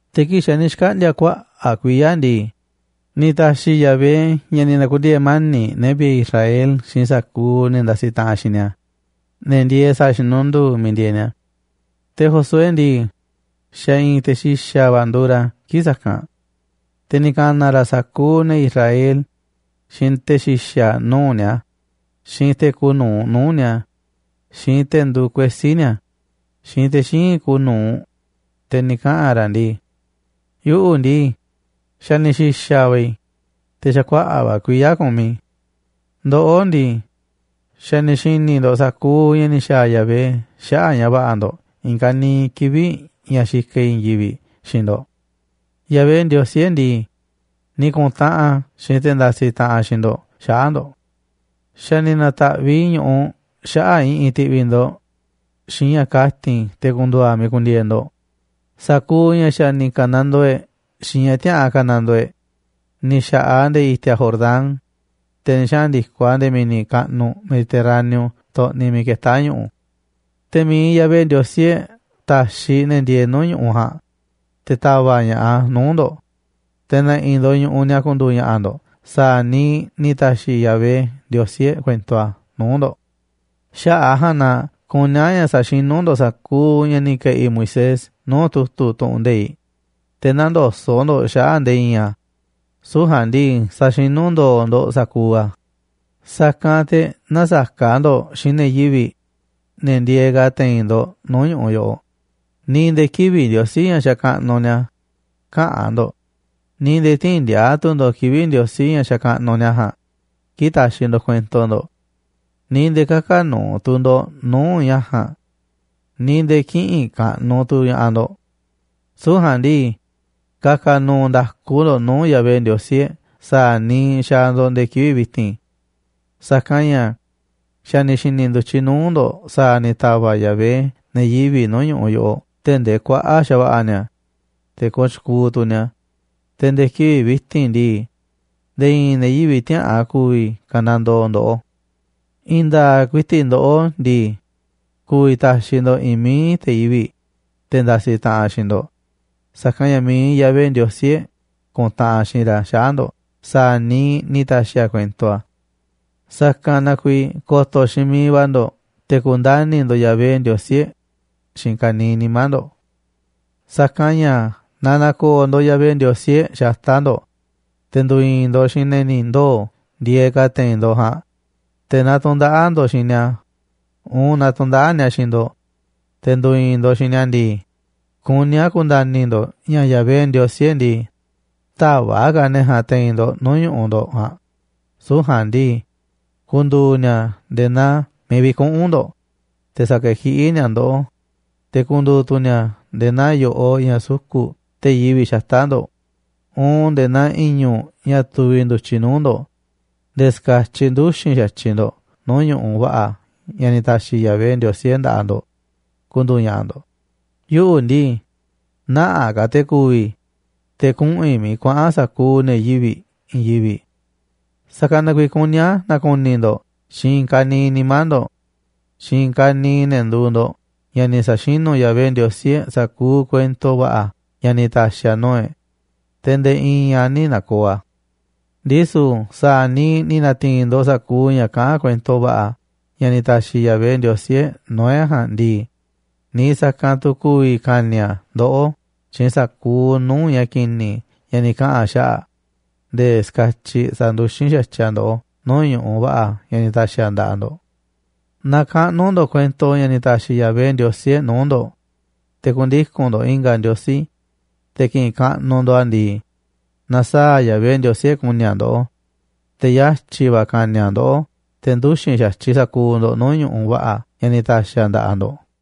Te̱ kii̱ꞌ xa̱ ni̱ xkaꞌndi̱a̱ kuaꞌa̱ꞌ kuiya̱ ndii, ni̱ ta̱xi̱ Yahvé ña̱ ni̱ na̱ku̱ndiee̱ mani̱ꞌ ne̱ vi̱ꞌe̱ Israel xiinꞌ sa̱kuuꞌ ne̱ ndasiꞌ taꞌanꞌ xiinꞌ ni̱a̱, ne̱ ndieeꞌ sa̱a̱ xinunduu miiꞌ ndieeꞌ ni̱a̱. Te̱ Josué ndii, xa̱ i̱i̱n te̱ xi̱xa̱ va̱ nduuꞌ ra̱ kii̱ꞌ sa̱kanꞌ. Te̱ ni̱ ka̱na̱ ra̱ sa̱kuuꞌ ne̱ Israel, xiinꞌ te̱ xi̱xa̱ nuu̱ꞌ ñu̱u̱ ni̱a̱, xiinꞌ te̱ kuuꞌ nu̱uꞌ nuu̱ꞌ ni̱a̱, xiinꞌ te̱ nduuꞌ kuesí ni̱a̱, xiinꞌ te̱ xíinꞌ kuuꞌ nuu̱ꞌ, te̱ ni̱ kaꞌa̱n ra̱ ndii: ―Yuꞌu̱ ndii, xa̱ ni̱ xi̱xa̱ va̱ i̱, te̱ xa̱ kuaꞌa̱ꞌ va̱ kuiya̱ kumiꞌ i̱. Ndoꞌó ndii, xa̱ ni̱ xi̱ni̱ ndo̱ꞌ sa̱kuuꞌ ña̱ ni̱ xa̱a̱ Yahvé xaꞌa̱ꞌ ña̱ va̱ꞌa̱ ndo̱ꞌ i̱i̱n ka̱niiꞌ kivi̱ꞌ ña̱ xikaꞌ i̱ i̱i̱n yivi̱ꞌ xiinꞌ ndo̱ꞌ. Yahvé, Ndiosí e̱ꞌ ndii, ni̱ kuntaꞌanꞌ a̱ xiinꞌ te̱ ndasiꞌ taꞌanꞌ xiinꞌ ndo̱ꞌ xaꞌa̱ꞌ ndo̱ꞌ. Xa̱ ni̱ na̱ta̱ꞌviꞌ i̱ ñu̱ꞌuꞌ xaꞌa̱ꞌ i̱ꞌi̱n ti̱ꞌvi̱ ndo̱ꞌ xiinꞌ ña̱ kati̱n te̱ ku̱ndu̱u̱ a̱ miiꞌ ku̱ndi̱e̱e̱ ndo̱ꞌ, sa̱kuuꞌ ña̱ xa̱ ni̱ ka̱nandoo e̱ꞌ xiinꞌ ña̱ tiäꞌa̱an ka̱nandoo e̱ꞌ. Ni̱ xa̱ꞌaꞌ a̱ nde̱e̱ i̱ti̱a̱ Jordán, te̱ ni̱ xaꞌa̱n ndi̱koꞌ a̱ nde̱e̱ mi̱ni̱ kaꞌnuꞌ Mediterráneo xtoꞌniꞌ miiꞌ ketá ñu̱ꞌu̱. Te̱ mi̱iꞌ Yahvé, Ndiosí e̱ꞌ, ta̱xiꞌ ne̱ ndieeꞌ nuu̱ꞌ ñu̱ꞌuꞌ ja̱a̱nꞌ, te̱ ta̱va̱ꞌ ña̱ꞌaꞌ a̱ nuu̱ꞌ ndo̱ꞌ, te̱ ne̱ꞌi̱ ndo̱ꞌ ñu̱ꞌuꞌ ni̱a̱ ku̱ndu̱u̱ ña̱ꞌa̱ ndo̱ꞌ sa̱a̱ niiꞌ ni̱ ta̱xiꞌ Yahvé, Ndiosí e̱ꞌ, kuento a̱ nuu̱ꞌ ndo̱ꞌ. ’Xaꞌa̱ꞌ a̱ ja̱a̱nꞌ na kuní a̱ ña̱ sa̱xinú ndo̱ꞌ sa̱kuuꞌ ña̱ ni̱ ke̱ꞌi̱ Moisés nuu̱ꞌ tu̱tu̱ tu̱ꞌu̱n nde̱iꞌ, te̱ nä̱ndoso̱ꞌ ndo̱ꞌ xaꞌa̱ꞌ nde̱e̱ i̱i̱n a̱, süu̱ꞌ ja̱a̱nꞌ ndii, sa̱xinú ndo̱o̱ ndo̱ꞌ sa̱kuuꞌ a̱. Sa̱kanꞌ te̱ nä̱saka̱ ndo̱ꞌ xiinꞌ ne̱ yivi̱ꞌ, ne̱ ndieeꞌ ka̱ te̱i̱n ndo̱ꞌ nuu̱ꞌ ñu̱ꞌuꞌ yoꞌoꞌ, ni̱ nde̱e̱ kivi̱ꞌ ndiosí ña̱ xakaꞌnuꞌ ni̱a̱ käꞌa̱n ndo̱ꞌ, ni̱ nde̱e̱ tï̱i̱n ndi̱a̱a̱ tu̱ ndo̱ꞌ kivi̱ꞌ ndiosí ña̱ xakaꞌnuꞌ ni̱a̱ ja̱a̱nꞌ kii̱ꞌ taxiꞌ ndo̱ꞌ kuento ndo̱ꞌ, ni̱ nde̱e̱ kä̱ka̱ nu̱u̱ tu̱ ndo̱ꞌ nuu̱ꞌ ña̱ ja̱a̱nꞌ, ni̱ nde̱e̱ kï̱ꞌi̱n kaꞌnuꞌ tu̱ ña̱ꞌaꞌ ndo̱ꞌ. Süu̱ꞌ ja̱a̱nꞌ ndii, ka̱ka̱ nu̱u̱ nda̱ku ndo̱ꞌ nuu̱ꞌ Yahvé, Ndiosí e̱ꞌ, sa̱a̱ niiꞌ xaaꞌ ndo̱ꞌ nde̱e̱ kivi̱ꞌ vi̱ti̱n. ’Sa̱kanꞌ ña̱ xa̱ ni̱ xi̱ni̱ ndu̱tyiꞌ nuu̱ꞌ ndo̱ꞌ sa̱a̱ ni̱ ta̱va̱ꞌ Yahvé ne̱ yivi̱ꞌ nuu̱ꞌ ñu̱ꞌuꞌ yoꞌoꞌ tee̱ꞌ ndee kuaꞌa̱ꞌ xa̱va̱ꞌa̱ ni̱a̱, te̱ kooꞌ tyukuuꞌ tu̱ ni̱a̱, te̱ nde̱e̱ kivi̱ꞌ vi̱ti̱n ndii, nde̱e̱ i̱i̱n ne̱ yivi̱ꞌ tiäꞌa̱an ku̱vi̱ ka̱nandoo ndoꞌó. I̱i̱n nda̱a̱ꞌ ku̱i̱ti̱ꞌ ndoꞌó ndii, ku̱vi̱ ta̱xiꞌ ndo̱ꞌ i̱i̱n mií te̱ yivi̱ꞌ, te̱ ndasiꞌ taꞌanꞌ xiinꞌ ndo̱ꞌ, sa̱kanꞌ ña̱ mi̱iꞌ Yahvé, Ndiosí e̱ꞌ, ku̱ntaꞌanꞌ xiinꞌ ra̱ xaꞌa̱ꞌ ndo̱ꞌ sa̱a̱ niiꞌ ni̱ ta̱xi̱ a̱ kuento a̱. Sa̱kanꞌ na kuiiꞌ ko̱to̱ xiinꞌ miiꞌ va̱ ndo̱ꞌ te̱ ku̱ndani̱ ndo̱ꞌ Yahvé, Ndiosí e̱ꞌ, xiinꞌ ka̱niiꞌ nimá ndo̱ꞌ. ’Sa̱kanꞌ ña̱ naaꞌ na̱ko̱o̱ ndo̱ꞌ Yahvé, Ndiosí e̱ꞌ, xata̱ꞌ ndo̱ꞌ, te̱ ndu̱i̱i̱n ndo̱ꞌ xiinꞌ ne̱ ni̱ ndoo̱ ndieeꞌ ka̱ te̱i̱n ndo̱ꞌ ja̱a̱nꞌ, te̱ naaꞌ tu̱ndaꞌa̱ꞌ ndo̱ꞌ xiinꞌ ni̱a̱ uun naaꞌ tu̱ndaꞌa̱ꞌ ni̱a̱ xiinꞌ ndo̱ꞌ, te̱ ndu̱i̱i̱n ndo̱ꞌ xiinꞌ ni̱a̱ ndii, kuní a̱ ku̱nda̱ni̱ ndo̱ꞌ ña̱ Yahvé, Ndiosí e̱ꞌ ndii, tä̱va̱ꞌ ka̱ a̱ ne̱ ja̱a̱nꞌ te̱i̱n ndo̱ꞌ nuu̱ꞌ ñu̱ꞌuꞌ ndo̱ꞌ ja̱a̱nꞌ, süu̱ꞌ ja̱a̱nꞌ ndii, ku̱ndu̱u̱ ni̱a̱ nde̱e̱ naa miiꞌ vi̱kuꞌu̱n ndo̱ꞌ, te̱ sa̱kekiꞌí ni̱a̱ ndoꞌó. Te̱ ku̱ndu̱u̱ tu̱ ni̱a̱ nde̱e̱ naa yo̱ꞌoꞌ ña̱ suku̱ꞌ te̱ yivi̱ꞌ xata̱ꞌ ndo̱ꞌ, uun nde̱e̱ naa i̱ñu̱ꞌ ña̱ tuviꞌ ndu̱tyiꞌ nuu̱ꞌ ndo̱ꞌ, nde̱e̱ ska̱tyiꞌ nduxi̱n xa̱tyiꞌ ndo̱ꞌ nuu̱ꞌ ñu̱ꞌuꞌ va̱ꞌa̱ ña̱ ni̱ ta̱xi̱ Yahvé, Ndiosí e̱ꞌ, nda̱ꞌaꞌ ndo̱ꞌ ku̱ndu̱u̱ ña̱ꞌa̱ ndo̱ꞌ. ’Yuꞌu̱ ndii, nä̱ꞌaꞌ ka̱ te̱ ku̱vi̱ i̱, te̱ kuꞌu̱n i̱ miiꞌ kuaꞌa̱n sa̱kuuꞌ ne̱ yivi̱ꞌ i̱i̱n yivi̱ꞌ. Sa̱kanꞌ na kuiiꞌ kuní a̱ na̱ku̱ni̱ ndo̱ꞌ xiinꞌ i̱i̱n ka̱niiꞌ nimá ndo̱ꞌ xiinꞌ i̱i̱n ka̱niiꞌ ne̱ nduuꞌ ndo̱ꞌ ña̱ ni̱ sa̱xinu̱ Yahvé, Ndiosí e̱ꞌ, sa̱kuuꞌ kuento va̱ꞌa̱ ña̱ ni̱ ta̱xi̱ a̱ nuu̱ꞌ e̱ꞌ, te̱ nde̱e̱ i̱i̱n a̱ nï̱ na̱ko̱o̱ a̱. Ndisu̱ sa̱a̱ niiꞌ ni̱ na̱ti̱i̱n ndo̱ꞌ sa̱kuuꞌ ña̱ kaꞌán kuento va̱ꞌa̱ ña̱ ni̱ ta̱xi̱ Yahvé, Ndiosí e̱ꞌ, nuu̱ꞌ e̱ꞌ ja̱a̱nꞌ ndii, niiꞌ sa̱kanꞌ tu̱ ku̱vi̱ ka̱ni̱ a̱ ndoꞌó xiinꞌ sa̱kuuꞌ nuu̱ꞌ ña̱ ki̱ni̱ ña̱ ni̱ kaꞌa̱n a̱ xaꞌa̱ꞌ nde̱e̱ ska̱tyiꞌ sa̱nduxín xa̱tyiꞌ a̱ ndoꞌó nuu̱ꞌ ñu̱ꞌuꞌ va̱ꞌa̱ ña̱ ni̱ ta̱xi̱ a̱ nda̱ꞌaꞌ ndo̱ꞌ. Naaꞌ kaꞌnu̱ ndo̱ꞌ kuento ña̱ ni̱ ta̱xi̱ Yahvé, Ndiosí e̱ꞌ, nuu̱ꞌ ndo̱ꞌ te̱ ku̱ndiku̱n ndo̱ꞌ i̱nga̱ ndiosí, te̱ ki̱ꞌi̱n kaꞌnuꞌ ndo̱ꞌ a̱ ndii, na̱saa̱ꞌ Yahvé, Ndiosí e̱ꞌ, ku̱ni̱ a̱ ndoꞌó, te̱ yatyi̱ va̱ ka̱ni̱ a̱ ndoꞌó nde̱e̱ nduxi̱n xa̱tyiꞌ sa̱kuuꞌ ndo̱ꞌ nuu̱ꞌ ñu̱ꞌuꞌ va̱ꞌa̱ ña̱ ni̱ ta̱xi̱ a̱ nda̱ꞌaꞌ ndo̱ꞌ ―ni̱ katyi̱ ra̱.